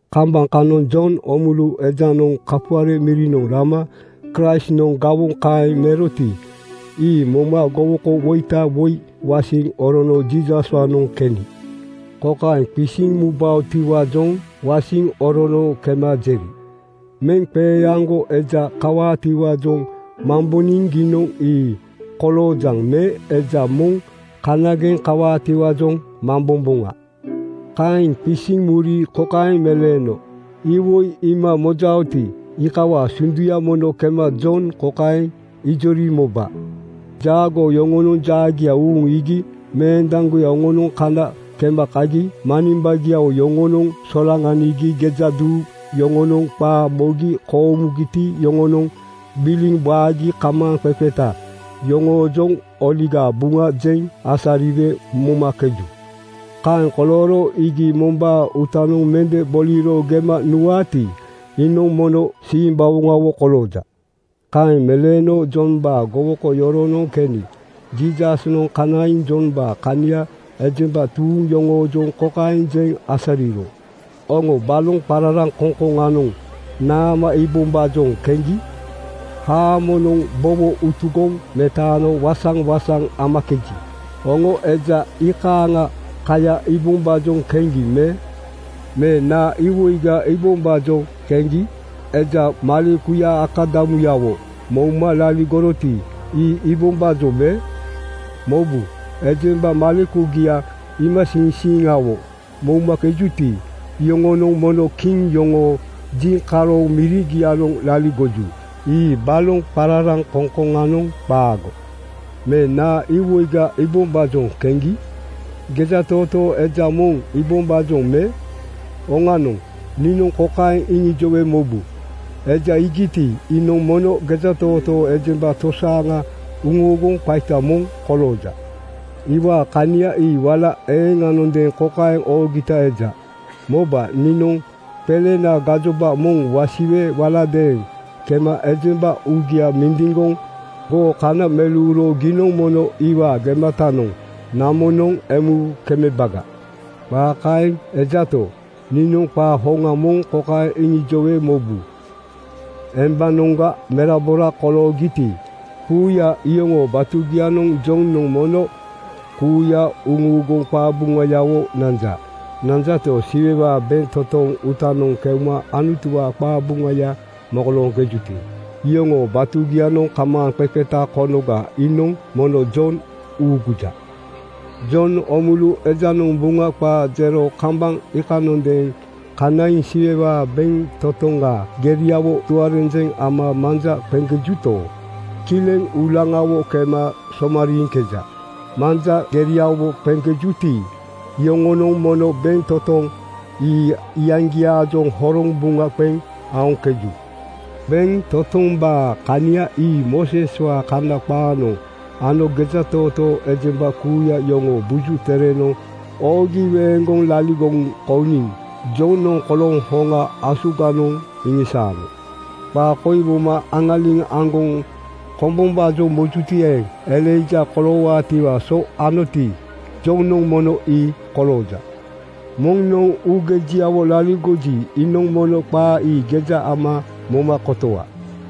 Kambaŋ kanoŋ Jon Oomulu ejanoŋ kapuare mirinoŋ rama Kraistnoŋ gawoŋ kaeŋ meroti, ii moma gowokowoita woi wasiŋ orono Jiisaswaanoŋ keni. Kokaeŋ qisiŋ mubaotiwaajoŋ wasiŋ orono kema jeri, “Meŋqeeaŋgo eja kawaatiwaajoŋ mamboniŋ giinoŋ ii koloojaŋ me eja moŋ kanageŋ kawaatiwaajoŋ mambomboŋa?” Kaeŋ qisiŋ muri kokaeŋ meleeno, “Iwoi iima mojaoti, iikawaa sunduya mono kema Jon kokaeŋ ijori moba: Jaagoo yoŋonoŋ jaagia uuŋ iigi meendaŋgoya yoŋonoŋ kana kema kagi manimbagiawo yoŋonoŋ solaŋanigi gejaduu yoŋonoŋ qaa mogi koomugiti yoŋonoŋ gbiliŋ waagi kamaaŋqeqeta yoŋoojoŋ Oligaa Buŋa jeŋ asariwe momakeju. Kaeŋ kolooro iigi mombaa uutanoŋ mende boliro gema nuwaati, iinoŋ mono simbawoŋawo kolooja.” Kaeŋ meleeno Jombaa gowoko yoronoŋ keni Jiisasnoŋ kanaiŋ Jombaa kania ejemba tuuŋ yoŋoojoŋ kokaeŋ jeŋ asariro, “Oŋo baloŋ qararaŋkoŋkoŋanoŋ naama iibombaajoŋ keŋgi? Haamonoŋ bowo utugoŋ metano waŋsaŋ-waŋsaŋ amakeji, oŋo eja iikaaŋa kaya iibombaajoŋ keŋgi me? Me naa iwoiga iibombaajoŋ keŋgi? Eja malekuya akadamuyawo mouma laligoroti, ii iibombaajoŋ me? Mobu, ejemba malekugia iimasiiŋsiiŋawo moumakejuti, iyoŋonoŋ mono kiŋ yoŋoo jiŋkaroŋ mirigianoŋ laligoju. Ii baloŋ qararaŋkoŋkoŋanoŋ qaago. “Me naa iwoiga iibombaajoŋ keŋgi? Gejatootoo eja moŋ iibombaajoŋ me? Oŋanoŋ, niinoŋ kokaeŋ iŋijowe mobu: Eja iigiti, iinoŋ mono gejatootoo ejemba tosaaŋa uŋuuguŋ qaita moŋ kolooja. Iwaa kania ii wala eeŋanondeeŋ kokaeŋ oogita eja, ‘Moba, niinoŋ qelena gajoba moŋ wasiwe waladeeŋ kema ejemba uugia mindiŋgoŋ goo kana meleuro giinoŋ mono iwaa gematanoŋ namonoŋ emu kemebaga.’ “Qaa kaeŋ ejato, niinoŋ qaa hoŋa moŋ kokaeŋ iŋijowe mobu: Embanoŋga merabora koloogiti, kuuya iyoŋoo batugianoŋ Jonoŋ mono kuuya uŋuuguŋ qabuŋayawo nanja. Nanjato, Siwewaa bentotoŋ uutanoŋ keuma Anutuwaa qabuŋaya mokolooŋkejuti, iyoŋoo batugianoŋ kamaaŋqeqeta konoga iinoŋ mono Jon uuguja. “Jon Oomulu ejanoŋ Buŋa qaa jero kambaŋ iikanondeeŋ kanaiŋ Siwewaa bentotoŋa geriawo tuarenjeŋ ama manja qeŋkejuto, kileŋ uulaŋawo kema somariiŋkeja. Manja geregiawo qeŋkejuti, iyoŋonoŋ mono bentotoŋ ii iyaŋgiaajoŋ horoŋ buŋa qeŋ aoŋkeju. Bentotombaa kania ii Mooseswaa Kana qaanoŋ ano gejatootoo ejemba kuuya yoŋoo Buju Terenoŋ oogi weeŋgoŋ laligoŋ kouniŋ Jonoŋ kolooŋ hoŋa asuganoŋ iŋisaano. Qaa koi moma aŋaliŋ aŋgoŋ kombombaajoŋ mojuti eeŋ, Elaija koloowaatiwaa so anoti, Jonoŋ mono ii kolooja. Moŋnoŋ uugejiawo laligoji, iinoŋ mono qaa ii geja ama moma kotowa.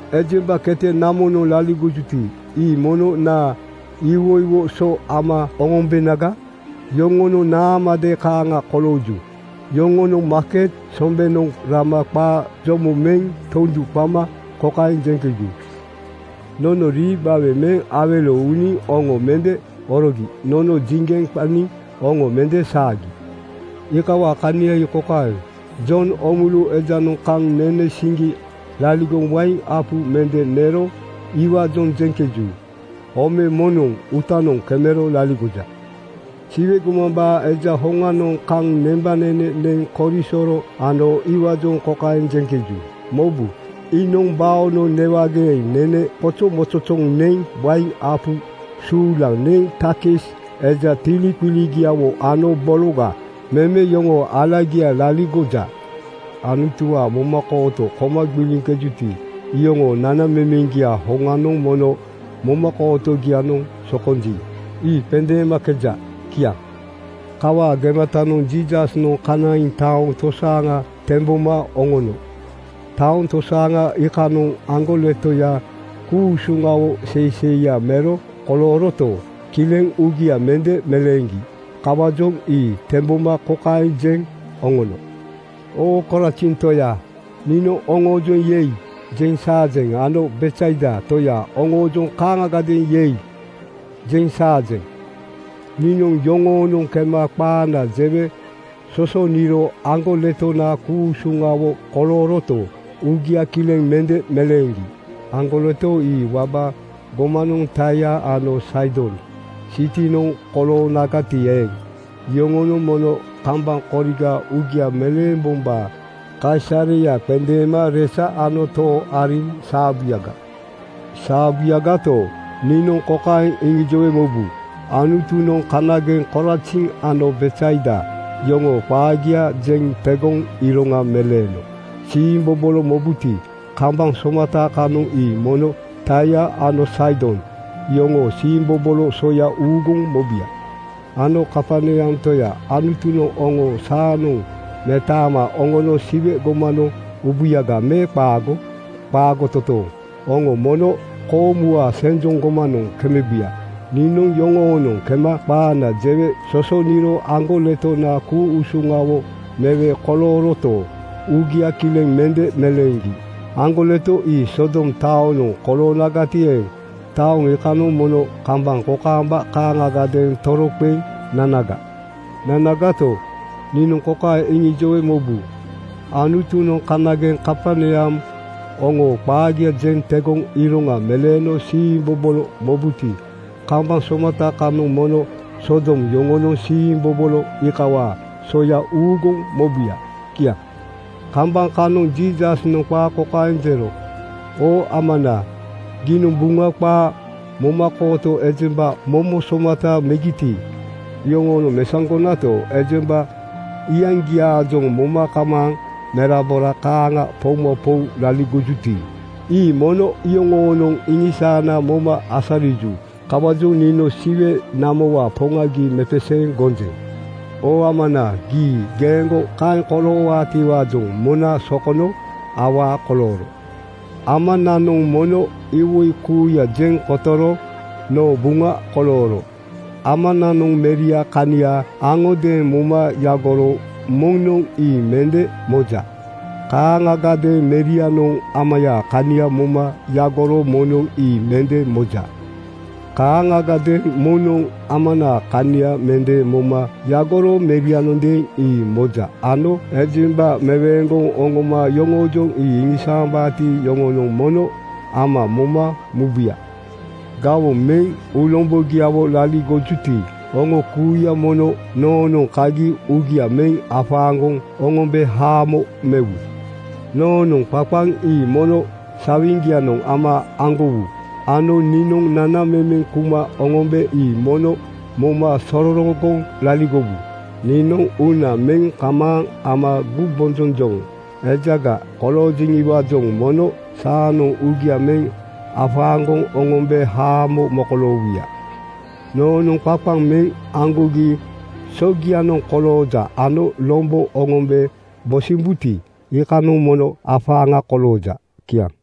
“Ejemba kete namonoŋ laligojuti, ii mono naa iwoiwo so ama oŋombenaga? Yoŋonoŋ naamade kaaŋa kolooju. Yoŋonoŋ maaket sombenoŋ rama qaa jomo meŋ tondu qama kokaeŋ jeŋkeju, ‘Nono rii gbawe meŋ awelo uuniŋ oŋo mende orogi. Nono jiŋgeŋ qaniŋ oŋo mende saagi.’ “Iikawaa kania ii kokaeŋ: Jon Oomulu ejanoŋ kaŋ nene siŋgi laligoŋ wain apu mende nero iwaajoŋ jeŋkeju, ‘Ome moŋnoŋ uutanoŋ kemero laligoja.’ “Siwe gomambaa Eja hoŋanoŋ kaŋ nembanene neŋ korisoro ano iwaajoŋ kokaeŋ jeŋkeju, ‘Mobu, iinoŋ baonoŋ newageeŋ nene qozozoŋgoŋ neŋ wain apu suulaŋ neŋ takis eja tiliqiligiawo ano bologa meme yoŋoo alagiaga laligoja.’ Anutuwaa momakooto koma gbiliŋkejuti, iyoŋoo nanamemeŋgiaa hoŋanoŋ mono momakootogianoŋ sokonji, ii qendeemakeja.” Kiaŋ. Kawaa gematanoŋ Jiisasnoŋ kanaiŋ taoŋ tosaaŋa temboma oŋono. Taoŋ tosaaŋa iikanoŋ aŋgoletoya ku-usuŋawo seiseiya mero kolooroto, kileŋ uugia mende meleeŋgi. Kawaajoŋ ii temboma kokaeŋ jeŋ oŋono, “Oo Korazin toya, niinoŋ oŋoojoŋ ‘Yei!’ jeŋ saajeŋ ano Betsaida toya, oŋoojoŋ kaaŋagadeeŋ ‘Yei!’ jeŋ saajeŋ. Niinoŋ yoŋoonoŋ kema qaana jewe sosoniro aŋgoletona ku-usuŋawo kolooroto, uugia kileŋ mende meleeŋgi. Aŋgoleto ii waba gomanoŋ Taia ano Saidon sitinoŋ koloonagati eeŋ, iyoŋonoŋ mono kambaŋ koriga uugia meleembombaa kaisareya qendeema resa ano too ariŋ saabuyaga. “Saabuyagato, niinoŋ kokaeŋ iŋijowe mobu: Anutunoŋ kanageŋ Korazin ano Betsaida yoŋoo qaagia jeŋ tegoŋ iroŋa meleeno siimbobolo mobuti, kambaŋ somata kanoŋ ii mono Taia ano Saidon iyoŋoo siimbobolo soya uuguŋ mobuya. “Ano Kaperneam toya, Anutunoŋ oŋo saanoŋ metaama oŋono Siwe gomanoŋ ubuyaga me qaago? Qaago totooŋ! Oŋo mono koomuwaa senjoŋ gomanoŋ kemebuya. Niinoŋ yoŋoonoŋ kema qaana jewe sosoniro aŋgoletona ku-usuŋawo mewe kolooroto, uugia kileŋ mende meleeŋgi. Aŋgoleto ii Sodom taonoŋ koloonagati eeŋ, taoŋ iikanoŋ mono kambaŋ kokaamba kaaŋagadeeŋ toroqeŋ nanaga. “Nanagato, niinoŋ kokaeŋ iŋijowe mobu: Anutunoŋ kanageŋ Kaperneam oŋoo qaagia jeŋ tegoŋ iroŋa meleeno siimbobolo mobuti, kambaŋ somata kanoŋ mono Sodom yoŋonoŋ siimbobolo iikawaa soya uuguŋ mobuya.” Kiaŋ. Kambaŋ kanoŋ Jiisasnoŋ qaa kokaeŋ jero, “Oo Amana, giinoŋ Buŋa qaaga momakooto ejemba momo somata megiti, iyoŋoonoŋ mesaŋgonato, ejemba iyaŋgiaajoŋ moma kamaaŋ merabora kaaŋa poumapou laligojuti, ii mono iyoŋoonoŋ iŋisaana moma asariju. Kawaajoŋ niinoŋ Siwe namowaa Poŋa gii mepeseeŋ gonjeŋ. Oo Amana, gii geeŋgo kaeŋ koloowaatiwaajoŋ mona sokono awaa kolooro. “Amananoŋ mono iwoi kuuya jeŋ kotoro noo buŋa kolooro. Amananoŋ Meriaa kania aŋodeeŋ moma yagoro moŋnoŋ ii mende moja. Kaaŋagadeeŋ Merianoŋ Amayaa kania moma yagoro moŋnoŋ ii mende moja. Kaaŋagadeeŋ moŋnoŋ Amanaa kania mende moma yagoro Merianondeeŋ ii moja ano ejemba meweeŋgoŋ oŋoma yoŋoojoŋ ii iŋisaambaati, iyoŋonoŋ mono Ama moma mubuya. “Gawoŋ meŋ uulombogiawo laligojuti, oŋo kuuya mono noonoŋ kagi uugia meŋ afaaŋgoŋ oŋombe haamo mewu. Noonoŋ qaqaŋ ii mono sawiŋgianoŋ ama aŋgowu ano niinoŋ nanamemena kuma oŋombe ii mono moma sororogoŋ laligowu. Niinoŋ uuna meŋ kamaaŋ ama gumbonjonjoŋ ejaga koloojeŋiwaajoŋ mono saanoŋ uugia meŋ afaaŋgoŋ oŋombe haamo mokoloowuya. Noonoŋ qaqaŋ meŋ aŋgogi sogianoŋ kolooja ano lombo oŋombe bosimbuti, iikanoŋ mono afaaŋa kolooja.” Kiaŋ.